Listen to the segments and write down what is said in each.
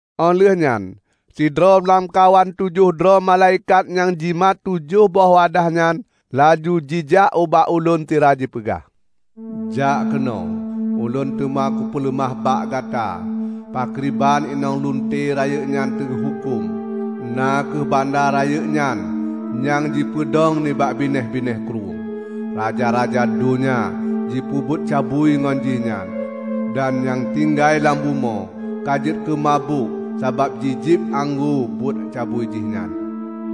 Óh lheueh nyan sidroe lamkawan tujoh droe malaikat nyang jimat tujoh boh wadah nyan laju jijak ubak ulôn sira jipeugah, "Jak keunoe, ulôn teuma kupeuleumah bak gata pakriban inong lunte rayeuk nyan teuhuköm, na kheueh banda rayeuk nyan nyang jipeudong nibak binéh-binéh krueng. Raja-raja donya jipeubuet cabui ngon jih nyan, dan nyang tinggai lam bumoe ka jeuet keu mabök sabab jijieb anggô buet cabui jih nyan."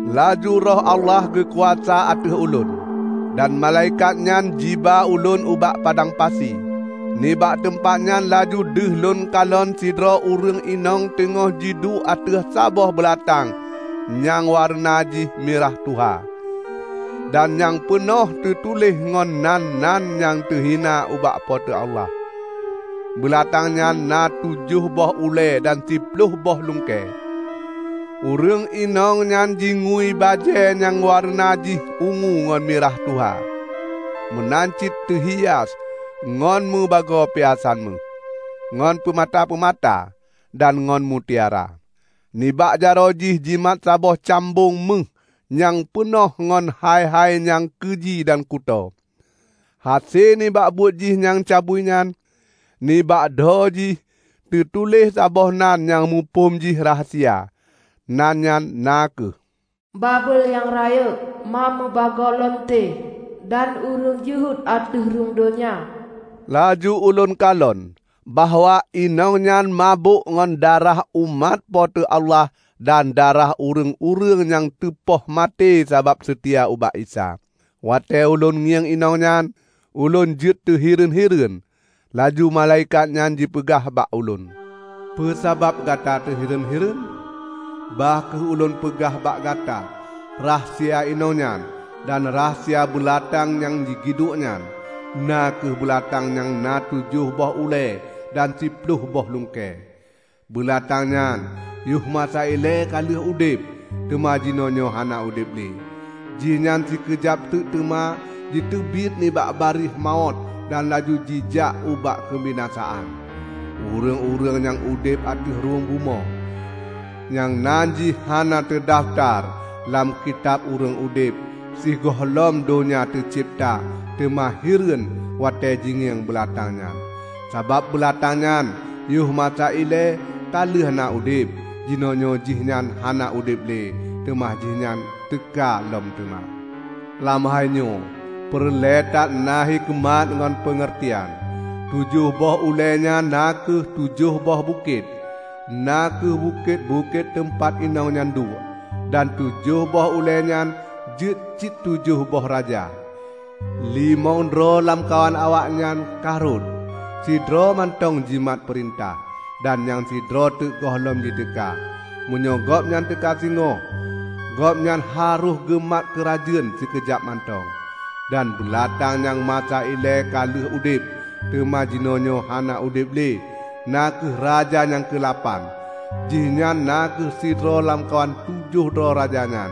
Laju Roh Allah geukuasa ateueh ulôn, dan malaikat nyan jiba ulôn ubak padang pasi. Nibak teumpat nyan laju deuh lôn kalon sidroe ureuëng inong teungoh jiduek ateueh saboh beulatang nyang wareuna jih mirah tuha, dan nyang peunoh teutuléh ngon nan-nan nyang teuhina ubak Po teu Allah. Beulatang nyan na tujoh boh ulée dan siploh boh lungkée. Ureuëng inong nyan jingui bajée nyang wareuna jih ungu ngon mirah tuha, meunan cit teuhia ngon mubagoe piasan méuh, ngon peumata-peumata, dan ngon mutiara. Nibak jaroe jih jimat saboh cambong méuh nyang peunoh ngon hai-hai nyang keuji dan kutoe, hase nibak buet jih nyang cabui nyan. Nibak dho jih teutuléh saboh nan nyang muphom jih rahsia. Nan nyan na kheueh, "Babel Nyang Rayeuk, ma meubagoe lunte dan ureuëng jeuhet ateueh rhueng donya." Laju ulôn kalon bahwa inong nyan mabök ngon darah umat Po teu Allah dan darah ureuëng-ureuëng nyang teupoh maté sabab seutia ubak Isa. Watée ulôn ngieng inong nyan, ulôn jeuet teuhireuen-hireuen. Laju malaikat nyan jipeugah bak ulôn, "Peue sabab gata teuhireuen-hireuen? Bah kheueh ulôn peugah bak gata rahsia inong nyan dan rahsia beulatang nyang jigiduek nyan, na kheueh beulatang nyang na tujoh boh ulée dan siploh boh lungkée. Beulatang nyan yoh masa ilée ka lheueh udeb, teuma jinoenyoe hana udeb lé. Jihnyan sikeujab teuk teuma jiteubiet nibak barieh mawöt dan laju jijak ubak keubinasaan. Ureuëng-ureuëng nyang udeb ateueh rhueng bumoe, nyang nan jih hana teudafeutar lam Kitab Ureuëng Udeb sigohlom donya teucebta teuma hireuen watée jingieng beulatang nyan. Sabab beulatang nyan yoh masa ilée ka lheueh na udeb. Jinoenyoe jihnyan hana udeb lé, teuma jihnyan teuka lom teuma. Lam hainyoe peureulée that na hikeumat ngon peungeurtian. Tujoh boh ulée nyan na kheueh tujoh boh bukét; na kheueh bukét-bukét teumpat inong nyan duek. Dan tujoh boh ulée nyan jeuet cit tujoh boh raja: limong droe lamkawan awaknyan ka rhot, sidroe mantong jimat peurintah, dan nyang sidroe teuk gohlom jiteuka. Meunyoe gobnyan teuka singoh, gobnyan harôh geumat keurajeuen sikeujab mantong. Dan beulatang nyang masa ilée ka lheueh udeb, teuma jinoenyoe hana udeb lé, na kheueh raja nyang keulapan. Jihnyan na kheueh sidroe lamkawan tujoh droe raja nyan,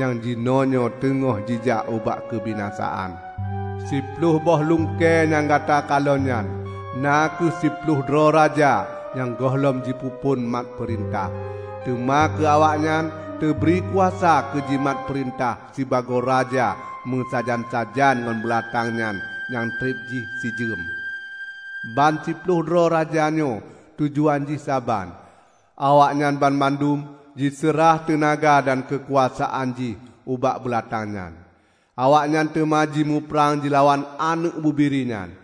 nyang jinoenyoe teungoh jijak ubak keubinasaan. Siploh boh lungkée nyang gata kalon nyan na kheueh siploh droe raja nyang gohlom jipeuphon mat peurintah. Teuma keu awaknyan teubri kuasa keu jimat peurintah sibagoe raja meusajan-sajan ngon beulatang nyan nyang treb jih sijeuem. Ban siploh droe raja nyoe tujuan jih saban; awaknyan banmandum jiseurah teunaga dan keukuasaan jih ubak beulatang nyan. Awaknyan teuma jimuprang jilawan Aneuëk Bubiri nyan.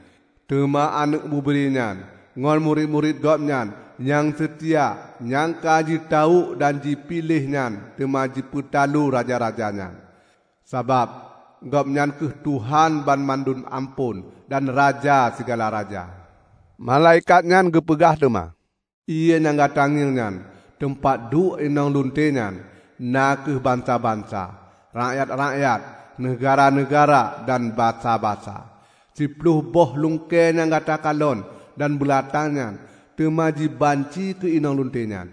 Teuma Aneuëk Bubiri nyan ngon murit-murit Gobnyan nyang seutia nyang ka jitawök dan jipiléh nyan teuma jipeutalo raja-raja nyan, sabab Gobnyan kheueh Tuhan banmandum amphon, dan Raja sigala raja." Malaikat nyan geupeugah teuma, "Ié nyang gata ngieng nyan, teumpat duek inong lunte nyan, na kheueh bansa-bansa, rakyat-rakyat, neugahra-neugahra dan basa-basa. Siploh boh lungkée nyang gata kalon dan beulatang nyan teuma jibanci keu inong lunte nyan.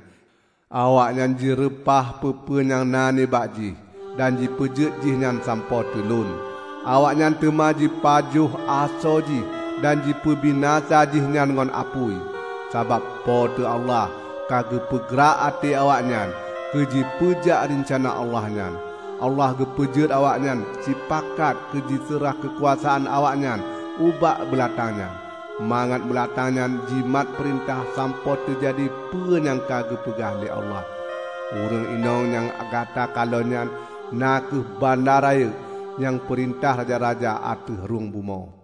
Awaknyan jireupah peue-peue nyang na nibak jih, dan jipeujeuet jih nyan sampoe teulon. Awaknyan teuma jipajoh asoe jih dan jipeubinasa jihnyan ngon apui. Sabab Po teu Allah ka geupeugrak até awaknyan keujipeujak reuncana Allah nyan. Allah geupeujeuet awaknyan sipakat keujiseurah keukuasaan awaknyan ubak beulatang nyan, mangat beulatang nyan jimat peurintah sampoe teujadi peue nyang ka geupeugah lé Allah. Ureuëng inong nyang gata kalon nyan na kheueh banda rayeuk, nyang peurintah raja-raja ateueh rhueng bumoe."